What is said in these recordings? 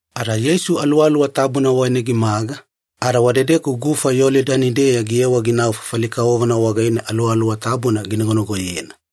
Ada Yeisu Aluwaluwa Tabuna wagaine gimaga, ada wadedeku gufa Yolidani-deya giyewa ginau fafali kavovona wagaine Aluwaluwa Tabuna ginagonagoyena.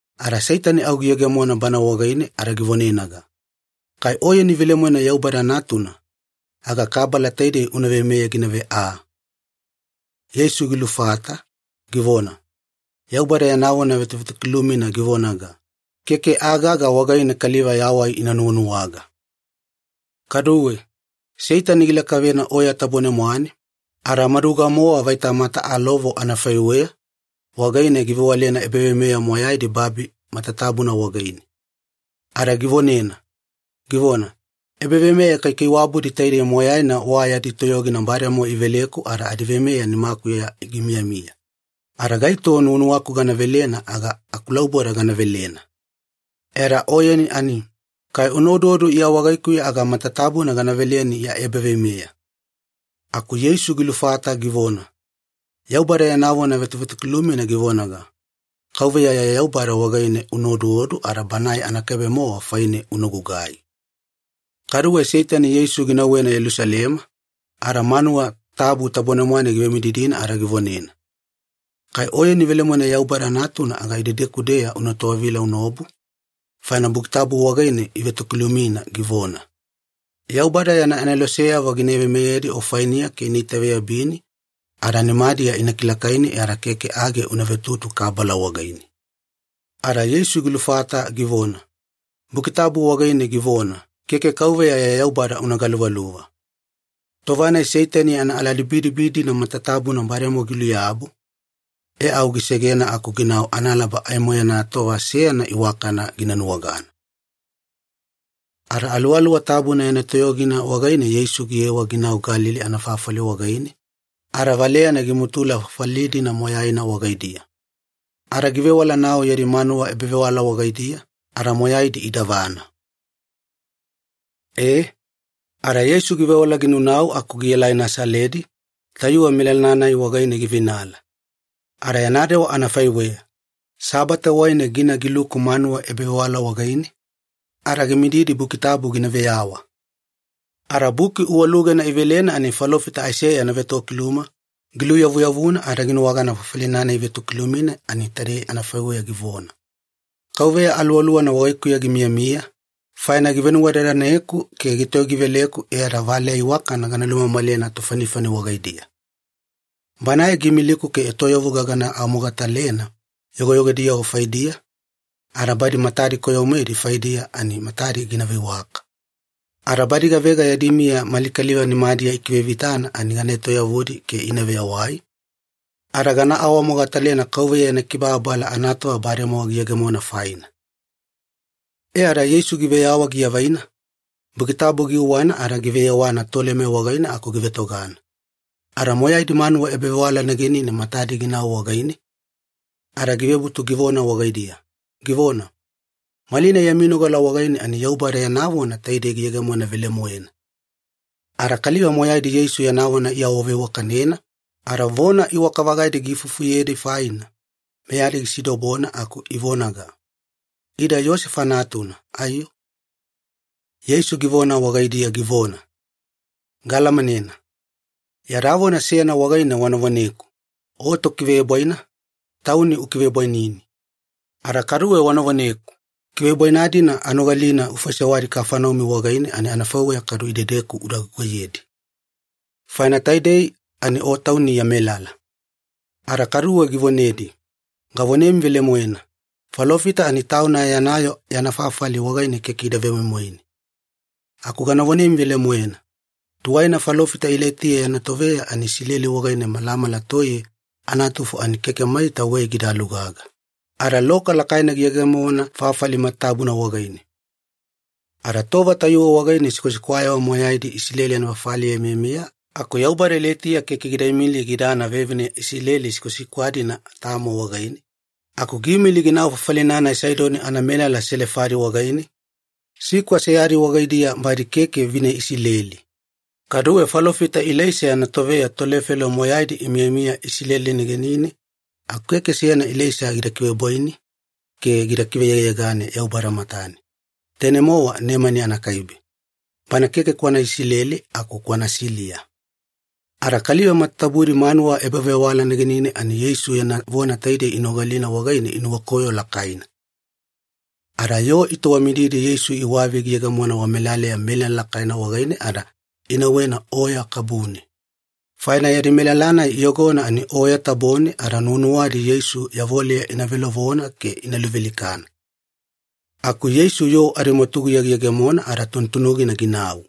Ada Seitani au giyegemona Bana wagaine ada givonenaga, “Kai Oyeni velemoena Yaubada Natuna, aga kabala taidei una veimeyena ginave aa.” Yeisu gilufata givona, “Yaubada yana vona vetovetokilumina givonaga, ‘Keke aa gaga wagaine kaliva yawai ina nuwanuwaga.’” Kaduwe, Seitani gilakavena oya tabone-mwane, ada maduga-mowa vaita mata alovo anafaiweya wagaine givewalena ebaveimeya moyaidi babi matatabuna wagaine. Ada givonena, givona, “Ebaveimeya kaikaiwabudi taidei moyaina wa yadi toyogina bademowa iveleku ada adiveimeya nimakuya gimiyamiya, ada gaito nuwanuwaku gana velena aga akulauboda gana velena. E ada Oyeni ani, kai una oduodu Iya wagaikuya aga matatabuna gana veleni ya ebaveimeya.” Aku Yeisu gilufata givona, “Yaubada yana vona vetovetokilumina givonaga, ‘KAUVEYA ya Yaubada wagaine una oduodu ada Banae anakaibe-mowa faine una gugai.’” Kaduwe Seitani Yeisu ginauwena Yelusalema, ada manuwa tabu tabone-mwane givemididina ada givonena, “Kai Oyeni velemoena Yaubada Natuna aga idedeku-deya una towavila unaobu, faina Buki Tabu wagaine ivetokilumina, givona, ‘Yaubada yana aneloseyavo gina veimeyedi o fainiya ke ina itaveyabini, ada nimadiya ina kilakaini e ada keke age una vetutu kabala wagaine.’” Ada Yeisu gilufata givona, “Buki Tabu wagaine givona, ‘Keke KAUVEYA ya Yaubada una galuvaluva.’” Tova-nai Seitani yana aladibidibi-dina matatabuna bademowa giluyabu, e au gisegena aku ginau analaba aimo yana tova seyana iwakana gina nuwagana. Ada Aluwaluwa Tabuna yana toyogina wagaine Yeisu giyewa ginau Galili anafafali wagaine, ada valeyana gimutula fafali-dina moyaina wagaidiya. Ada givewala-nau yadi manuwa ebavewala wagaidiya, ada moyaidi idavana. E, ada Yeisu givewala ginaunau aku gielai Nasaledi, tayuwe melala-nai wagaine giveinala. Ada yana dewa anafaiweya, Sabate wagaine gina giluku manuwa ebavewala wagaine, ada gimididi Buki Tabu gina veyawa. Ada buki uwalugena ivelena ani falofita Aiseya yana vetokiluma, giluyavuyavuna ada ginuwagana fafali-nai ivetokilumina ani taidei anafaiweya givona, “KAUVEYA Aluwaluwana wagaikuya gimiyamiya, faina givenuwadadaneku ke gitoyogiveleku e ada valeya iwakana gana lumamalena tofanifani wagaidiya. Banae giimiliku ke etoyavuga gana awamogatalena yogoyogodiyavo faidiya, ada badi matadi koyo-moedi faidiya ani matadi gina veiwaka. Ada badi gavega yadi miya mali kaliva nimadiya ikivevitana ani gana etoyavudi ke ina veyawai, ada gana awamogatalena KAUVEYA yana kibababala anatova bademowa giyegemona faina.” E ada Yeisu giveyawa giavaina, Buki Tabu giuwana ada giveyewana tolema wagaine aku givetogana. Ada moyaidi manuwa ebavewala negenine matadi ginau wagaine, ada givebutu givona wagaidiya, givona, “Malinai yami nogala wagaine ani Yaubada yana vona taidei giyegemona velemoena.” Ada kaliva moyaidi Yeisu yana vona iawaveiwakanena ada vona iwaka-vagaidi giifufuyedi faina, meyadi gisidobona aku ivonaga, “Ida Iyosefa natuna, aiyo?” Yeisu givona wagaidiya, givona, “Gaalamanena. Yada vona seyana wagaine wana voneku, ‘O Tokivebwaina, tauni una kivebwainini.’ Ada kaduwe wana voneku, ‘Kivebwaina-dina anogalina ufaisewadi Kafaneumi wagaine ani anafaiweya kaduwe idedeku uda gugaiyedi. Faina taidei ani O Tauni ya melala.’” Ada kaduwe givonedi, “Gavonemi velemoena, falofita ani tauna yana yoo yana fafali wagaine keke ida vemoimoine. Aku gana vonemi velemoena, tuwaina falofita Ilaitiya yana toveya ani Isileli wagaine malamala toiye anatufo ani keke maita wei gida lugaga, ada loka lakaina giyegemona fafali matatabuna wagaine. Ada tova tayuwe wagaine sikwasikwayavo moyaidi Isileli anafafaliya imiyamiya aku Yaubada Ilaitiya keke gida imili gidana vevine Isileli sikwasikwa-dina tamo wagaine, aku giimili ginau fafali-nai Saidoni anamelala Selefadi wagaine, sikwa seyadi wagaidiya badi keke vine Isileli. Kaduwe falofita Ilaisa yana toveya tolefelo moyaidi imiyamiya Isileli negenine aku keke seyana Ilaisa gida kivebwaini ke gida kiveyegayegane Yaubada matane, tainei-mowa Nemani anakaibe, bana keke kwana Isileli aku kwana Siliya.” Ada kaliva matatabudi manuwa ebavewala negenine ani Yeisu yana vona taidei inogalina wagaine inuwakoyo lakaina. Ada yoo itowamididi Yeisu iwavi giyegemona wamelaleya melala lakaina wagaine ada inauwena oya kabune, faina yadi melala-nai iyogona ani oya tabone ada nuwanuwadi Yeisu yavoleya ina velovona ke ina luvealikana. Aku Yeisu yoo adimwatuguya giyegemona ada tunutunugina ginau.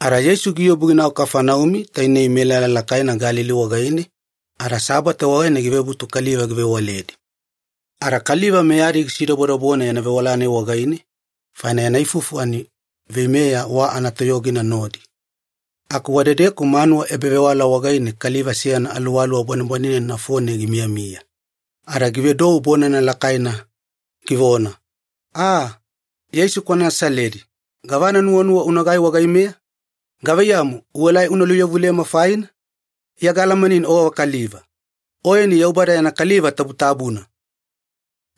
Ada Yeisu giobu ginau Kafaneumi, tainei melala lakaina Galili wagaine, ada Sabate wagaine givebutu kaliva givewaledi. Ada kaliva meyadi gisidobodobona yana vewala-nai wagaine, faina yana ifufu ani veimeya wa anatoyogina nodi. Aku wadedeku manuwa ebavewala wagaine kaliva seyana aluwaluwa bwanebwanenena nafone gimiyamiya. Ada givedou bonana lakaina, givona, “A! Yeisu kwana Nasaledi, gavana nuwanuwa unagai wagaimeya? Gavaiyamu, uelai una luyavulema faina? Iya gaalamaneni o gavakaliva. Oyeni Yaubada yana Kaliva Tabutabuna!”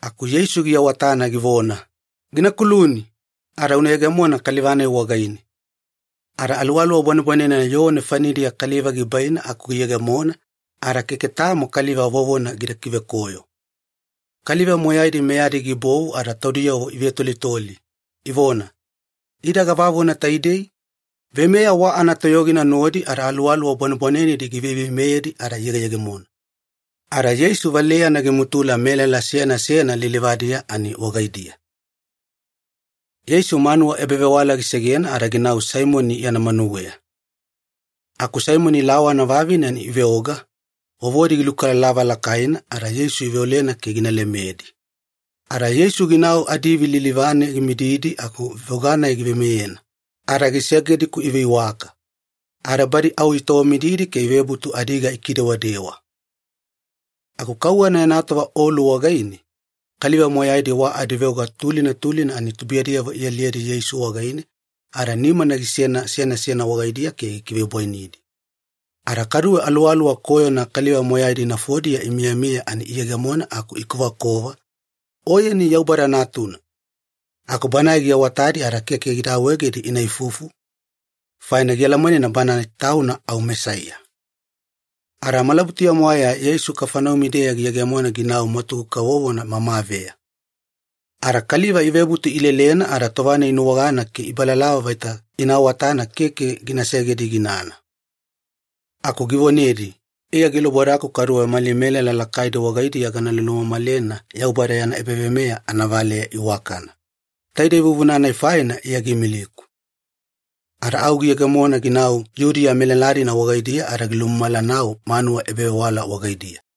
Aku Yeisu giawatana givona, “Gina kuluni, ada una yegemona kaliva-nai wagaine.” Ada aluwaluwa bwanebwanenena yoo nefanidiya kaliva gibaina aku giyegemona, ada keke tamo kaliva vovona gida kivekoyo. Kaliva moyaidi meyadi gibovu ada taudiyavo ivetolitoli, ivona, “Ida gavavona taidei? Veimeya wa anatoyogina nodi ada aluwaluwa bwanebwanenedi giveiveimeyedi ada iyegeyegemona!” Ada Yeisu valeyana gimutula melala seyana seyana lilivadiya ani wagaidiya. Yeisu manuwa ebavewala gisegena ada ginau Saimoni yana manuweya. Aku Saimoni lawana vavine ani iveoga, vovodi gilukalalava lakaina, ada Yeisu iveolena ke gina lemedi. Ada Yeisu ginau adiivi lilivane gimididi aku veoga-nai giveimeyena, ada gisegedi-ku iveiwaka. Ada badi au itowamididi ke ivebutu adiga ikidewadewa. Aku kauwana yana tova olu wagaine, kaliva moyaidi wa adiveoga tulina tulina ani tubuiyadiyavo ialiyedi Yeisu wagaine, ada nimana gisena seyana seyana wagaidiya ke gikivebwainidi. Ada kaduwe aluwaluwa koyona kaliva moyaidi nafodiya imiyamiya ani iyegemona aku ikovakova, “Oyeni Yaubada Natuna!” Aku Banae giawatadi ada keke gida awaegedi ina ifufu, faina ialamanena Banae Tauna au Mesaiya. Ada malabutuya-mwaeya Yeisu Kafaneumi-deya giyegemona ginau mwatugu kavovona mamaveya. Ada kaliva ivebutu ilelena ada tova-nai inuwagana ke ibalalava vaita ina awatana keke gina segedi ginana. Aku givonedi, “Iya gilubodaku kaduwe mali melala lakaidi wagaidiya gana lulumamalena Yaubada yana ebaveimeya anavaleya iwakana. Taide vuvuna-nai faina Iya giimiliku.” Ada au giyegemona ginau Yudiya melala-dina wagaidiya ada gilulumamala-nau manuwa ebavewala wagaidiya.